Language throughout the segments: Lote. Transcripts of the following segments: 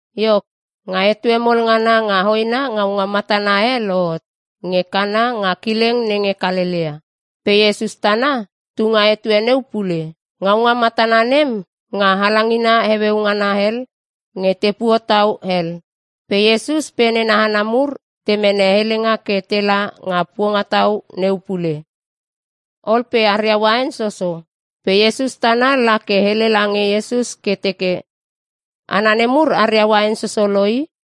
Iok, nga etue mol ngana nga hoena ngaunga matana e lohot nge Kana nga kileng nenge Kalelea, pe Iesus tana tu nga etue neu pule. (Ngaunga matana nem nga halangina heueu ngana hel nge te puotau hel.) Pe Iesus pe nena hana mur te mene helenga ke tela nga puongatau neu pule. Ol pe aria uain soso. Pe Iesus tana la ke hele lange Iesus ke teke, “Hana nemur aria uain soso lo i.”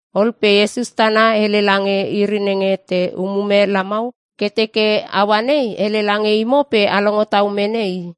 Ol pe Iesus tana hele lange iri nenge te umume lamau ke teke, “Aua nei hele lange imo pe a longo tau mene i.”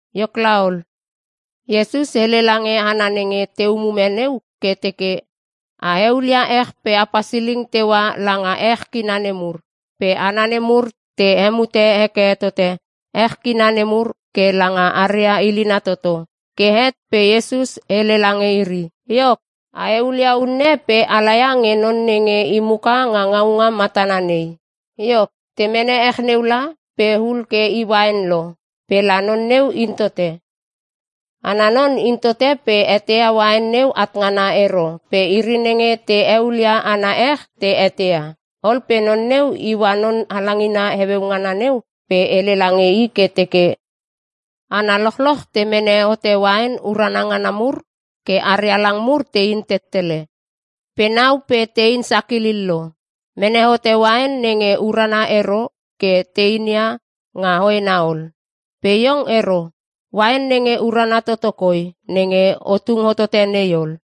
Iok laol, Iesus hele lange hana nenge te umume neu ke teke, “A eulia ech pe a pasiling teua langa ech kina nemur.” Pe hana nemur te hemute heke tote ech kina nemur ke langa haria ilina toto. Ke het pe Iesus hele lange iri, “Iok, a eulia unne pe ala ia nge non nenge i muka nga ngaunga matana nei.” Iok, te mene ech neu la, pe hul ke i uain lo pe la non neu in tote. Ana non in tote pe eteia uain neu at ngana ero pe iri nenge te eulia ana ech te eteia. Ol pe non neu iua non halangina heueu ngana neu pe hele lange i ke teke, “Hana lochloch te mene hote uain urana ngana mur ke aria lang mur tein tettele. Pe nau pe tein sakilil lo, mene hote uain nenge urana ero ke te inia nga hoena ol. Pe iong ero. Uain nenge urana toto koi nenge o tung hotote nei ol!”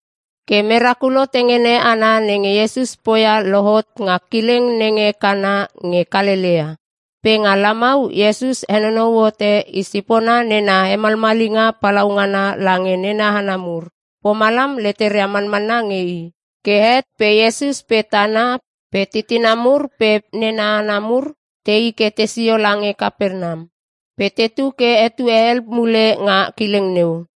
Ke merakulo tengene ana nenge Iesus poia lohot nga kileng nenge Kana nge Kalelea. Pe nga lamau Iesus henonou hote i sipona nena hemalmalinga palaungana lange nena hana mur. Pomalam leteria manmanna nge i. Ke het pe Iesus pe tana pe titina mur pe nena hana mur tei ke tesio lange Kapernam, pe tetu ke etue hel mule nga kileng neu.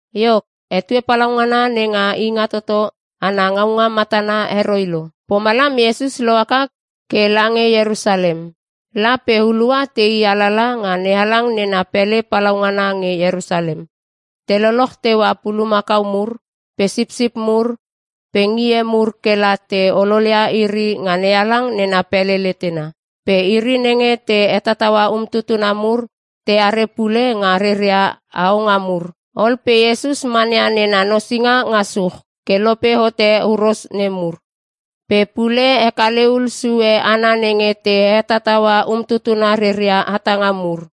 Iok, etue palaungana nenga Ingatoto ana ngaunga matana heroi lo. Pomalam Iesus lohaka ke lange Ierusalem. La pe hulua tei alala nga NeHalang nena pele palaungana nge Ierusalem. Te loloch teua pulumakau mur pe sipsip mur pe ngie mur kela te ololia iri nga NeHalang nena pele letena. Pe iri nenge te hetataua umtutuna mur teare pule nga reria haonga mur. Ol pe Iesus mania nena nosinga nga such ke lope hote huros nemur. Pe pule hekale hul sue hana nenge te hetataua umtutuna reria hatanga mur,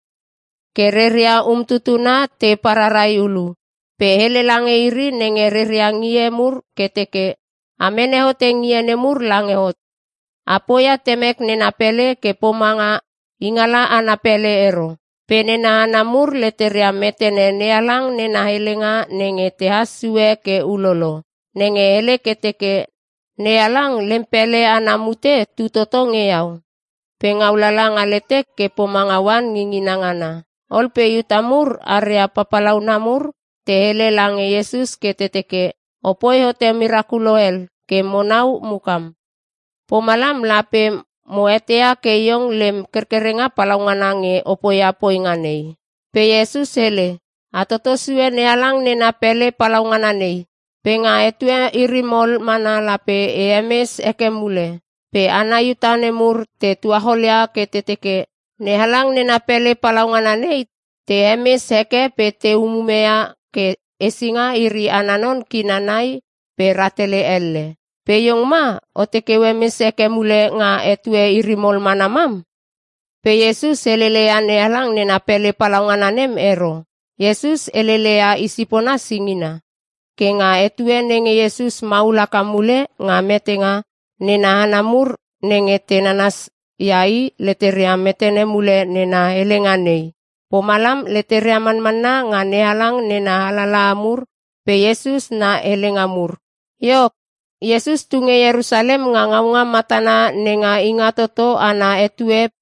ke reria umtutuna te pararai ulu. Pe hele lange iri nenge reria ngie mur ke teke, “A mene hote ngie nemur lange hot. A poia Temek nena pele ke pomanga ingala ana pele ero.” Pe nena hana mur leteria metene NeHalang nena helenga nenge tehas sue ke ulolo, nenge hele ke teke, “NeHalang lem pele ana mute tu toto nge iau. Pe ngaulala nga letek ke pomanga oan ngingina ngana.” Ol pe Iuta mur aria papalauna mur te hele lange Iesus ke te teke, “O poi hote merakulo hel ke monau mukam. Pomalam lape mo eteia ke Iong lem kerkerenga palaungana nge o poia poinga nei.” Pe Iesus hele, “A toto sue NeHalang nena pele palaungana nei, pe nga etue iri mol mana lape e hemes heke mule.” Pe hana Iuta nemur te tuacholia ke te teke, “NeHalang nena pele palaungana nei te hemes heke pe te umume ia ke hesinga iri ana non kina nai pe rahtele elle.(46) Pe iong ma oteke o hemes heke mule nga etue iri mol mana mam?” Pe Iesus helele ia NeHalang nena pele palaungana nem ero. Iesus helele ia i sipona singina. Ke nga etue nenge Iesus maul haka mule nga metenga, nena hana mur nenge te nananas ia i, leteria metene mule nena helenga nei. Pomalam leteria manmanna nga NeHalang nena alalaha mur pe Iesus na helenga mur. Iok, Iesus tunge Ierusalem nga ngaunga matana nenga Ingatoto ana etue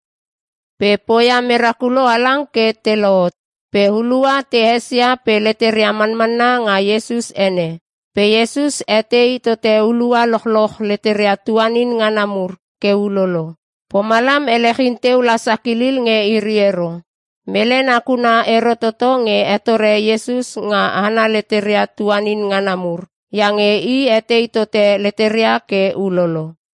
pe poia merakulo halang ke te lohot. Pe hulua te esia pe leteria manmanna nga Iesus ene. Pe Iesus etei tote hulua lochloch leteria tuanin ngana mur ke ulolo. Pomalam elechin teu la sakilil nge iri ero. Mele nakuna ero toto nge hetore Iesus nga hana leteria tuanin ngana mur. Iange i etei tote leteria ke ulolo.